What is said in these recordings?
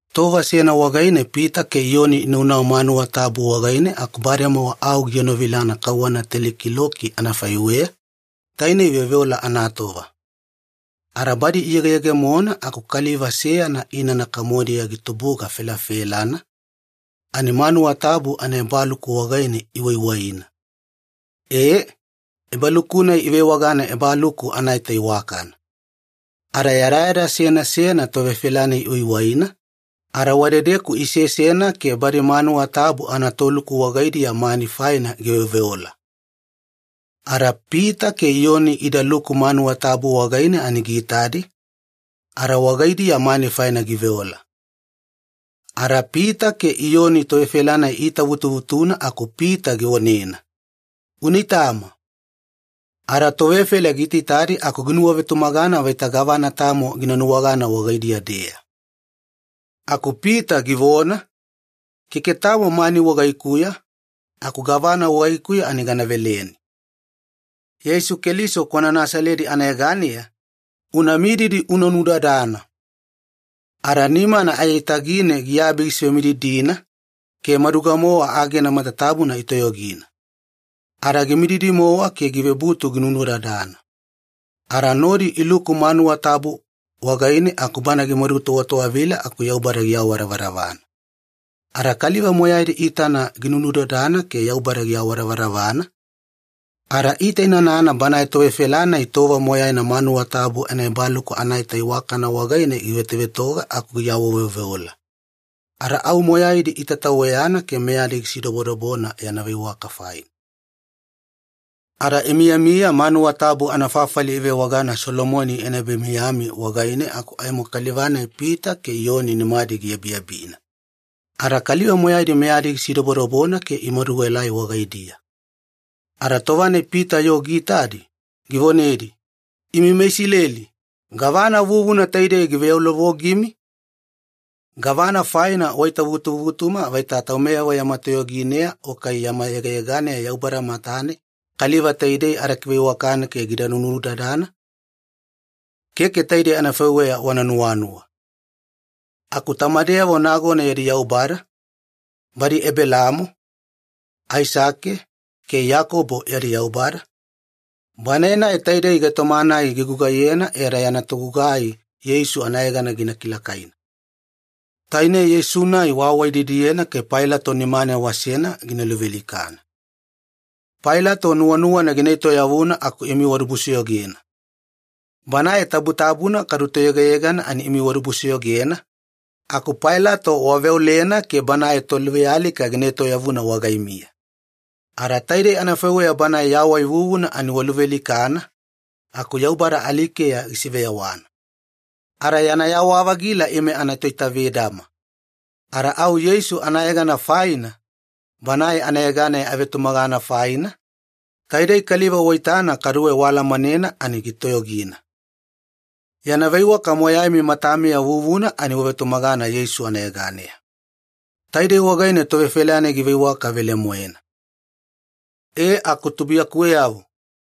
Tova seyana wagaine Pita ke Iyoni inaunau manuwa tabu wagaine aku bademowa au gienovilana kauwana teli kiloki anafaiweya, tainei veoveola anatova. Ada badi iyegeyegemona aku kaliva seyana inana kamodiya gitubuga felafelana, ani manuwa tabu anaebaluku wagaine iwaiwaina. E, ebaluku-nai ivewagana Ebaluku Anaita Iwakana. Ada yadayada seyana seyana tovefela-nai iwaiwaina, ada wadedeku isesena ke badi manuwa tabu anatoluku wagaidiya mani faina giveoveola. Ada Pita ke Iyoni idaluku manuwa tabu wagaine ani giitadi, ada wagaidiya mani faina giveola. Ada Pita ke Iyoni tovefela-nai iitavutuvutuna aku Pita givonena, “Una itama.” Ada tovefela giitaitadi aku ginuwavetumagana vaita gavana tamo gina nuwagana wagaidiya-deya. Aku Pita givona, “Keke tamo mani wagaikuya, aku gavana wagaikuya ani gana veleni. Yeisu Keliso kwana Nasaledi anayeganeya, una mididi una nudadana.” Ada nimana aiyatagine giabi gisivemididina, ke maduga-mowa agena matatabuna itoyogina. Ada gimadumididi-mowa ke givebutu ginunudadana. Ada nodi iluku manuwa tabu wagaine aku bana gimadutowatowavila aku Yaubada giawadavadavana. Ada kaliva moyaidi iitana ginunudadana ke Yaubada giawadavadavana, ada iitainanana banae tovefela-nai tova moyaina manuwa tabu anaEbaluku Anaita Iwakana wagaine givetovetoga aku giawaveoveola. Ada au moyaidi itataweyana ke meyadi gisidobodobona yana veiwaka faina. Ada imiyamiya manuwa tabu anafafali ivewagana Solomoni Yana Ebamiyami wagaine aku aimo kaliva-nai Pita ke Iyoni nimadi giabiabina. Ada kaliva moyaidi meyadi gisidobodobona ke imadu ielai wagaidiya. Ada tova-nai Pita yoo giitadi, givonedi, “Imi meIsileli, gavana vuvuna taidei giveyaulovogimi? Gavana faina waitavutuvutuma vaita taumeyavo yama toyogineya o kai yama yegayeganeya Yaubada matane kaliva taidei ada kiveiwakane ke gida nunudadana? Keke taidei anafaiweya wana nuwanuwa. Aku tamadeyavo nagona yadi Yaubada, badi Ebelaamo, Aisake, ke Iyakobo yadi Yaubada, Banae-nai taidei gaitoma-nai gigugaiyena e ada yana togugai Yeisu anayegana gina kilakaina. Taine Yeisu-nai waawaididiyena ke Pailato nimane wasena gina luvealikana. Pailato nuwanuwana gina etoyavuna aku imi wadibusoyogena. Banae Tabutabuna kadu Toyegayegana ani imi wadibusoyogena, aku Pailato waveolena ke banae toluvealika gina etoyavuna wagaimiya. Ada taidei anafaiweya Banae yawai vuvuna ani waluvealikana, aku Yaubada alikeya gisiveyawana. Ada yana yawa-vagila ime anatoitavedama. Ada au Yeisu anayegana faina, Banae anayeganeya avetumagana faina, taidei kaliva waitana kaduwe waalamanena ani gitoyogina. Yana veiwaka moyaimi matamiya vuvuna ani vetumagana Yeisu anayeganeya. Taidei wagaine tovefela-nai giveiwaka velemoena. “E aku tubuiyakuweyavo,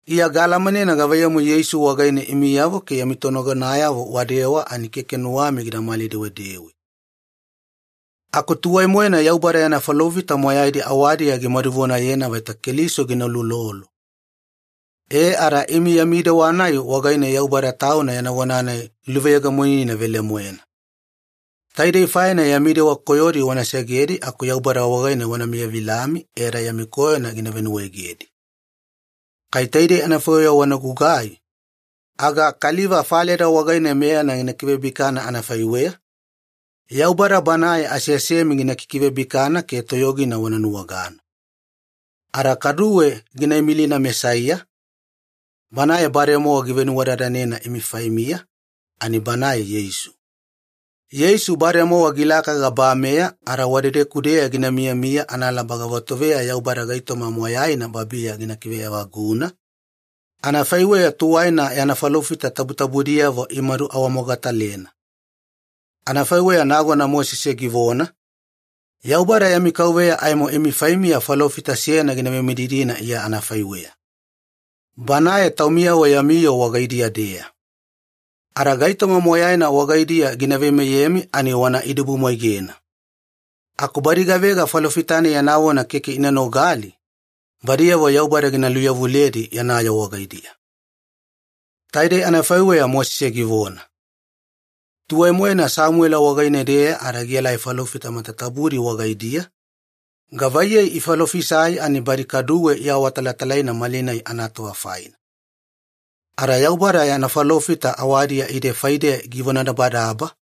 Iya gaalamanena gavaiyamu Yeisu wagaine imiyavo ke yami tonagonayavo wadewa ani keke nuwami gidamali-dewedewe. Aku tuwai-moena Yaubada yana falofita moyaidi awadiya gimadu vonayena vaita Keliso gina uloulolo. E ada imi yami dewa-nai wagaine Yaubada Tauna yana vona-nai giluveyegemonina velemoena. Taidei faina yami dewa koyodi wana segedi aku Yaubada wagaine wana miyavilami e ada yami koyona gina venuwaegedi. Kai taidei anafaiweya wana gugai, aga kaliva faleda wagaine meyana gina kivebikana anafaiweya, Yaubada Banae aseasemi gina kikivebikana ke toyogina wana nuwagana. Ada kaduwe gina imilina Mesaiya, Banae bademowa givenuwadadanena imi faimiya, ani Banae Yeisu. Yeisu bademowa gilaka gabameya ada wadedeku-deya gina miyamiya analaba gavatoveya Yaubada gaitoma moyaina babiya gina kiveevaguna, anafaiweya tuwaina yana falofita tabutabudiyavo imadu awamogatalena. Anafaiweya nagona Mosese givona, ‘Yaubada yami KAUVEYA aimo imi faimiya falofita seyana gina vemididina Iya anafaiweya. Banae taumiyavo yami yoo wagaidiya-deya. Ada gaitoma moyaina wagaidiya gina veimeyemi ani wana idibumwaigena. Aku badi gavega falofita-nai yana vona keke ina nogali, badiyavo Yaubada gina luyavuledi yana yoo wagaidiya.’ Taidei anafaiweya Mosese givona. “Tuwai-moena Samuwela wagaine-deya ada gielai falofita matatabudi wagaidiya, gavaiyei ifalofisai ani badi kaduwe iawatalatalaina malinai anatova faina. Ada Yaubada yana falofita awadiya ide faideya givonadabadaba,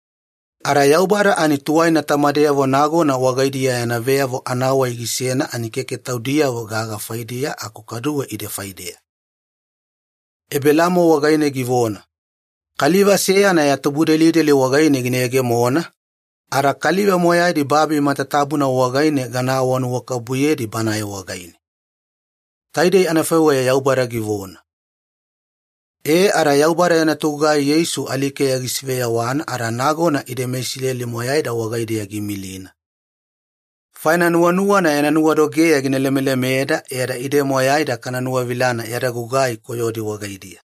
ada Yaubada ani tuwaina tamadeyavo nagona wagaidiya yana veyavo anawai gisena ani keke taudiyavo gaga faidiya aku kaduwe ide faideya. Ebelaamo wagaine givona, ‘Kaliva seyana ya tubudelideli wagaine gina yegemona, ada kaliva moyaidi babi matatabuna wagaine gana awanuwakabubuyedi Banae wagaine.’ Taidei anafaiweya Yaubada givona. E ada Yaubada yana togugai Yeisu alikeya gisiveyawana ada nagona ide meIsileli moyaida wagaideya giimilina. Faina nuwanuwana yana nuwadogeya gina lemelemeda e ada ide moyaida kana nuwavilana yada gugai koyodi wagaidiya.”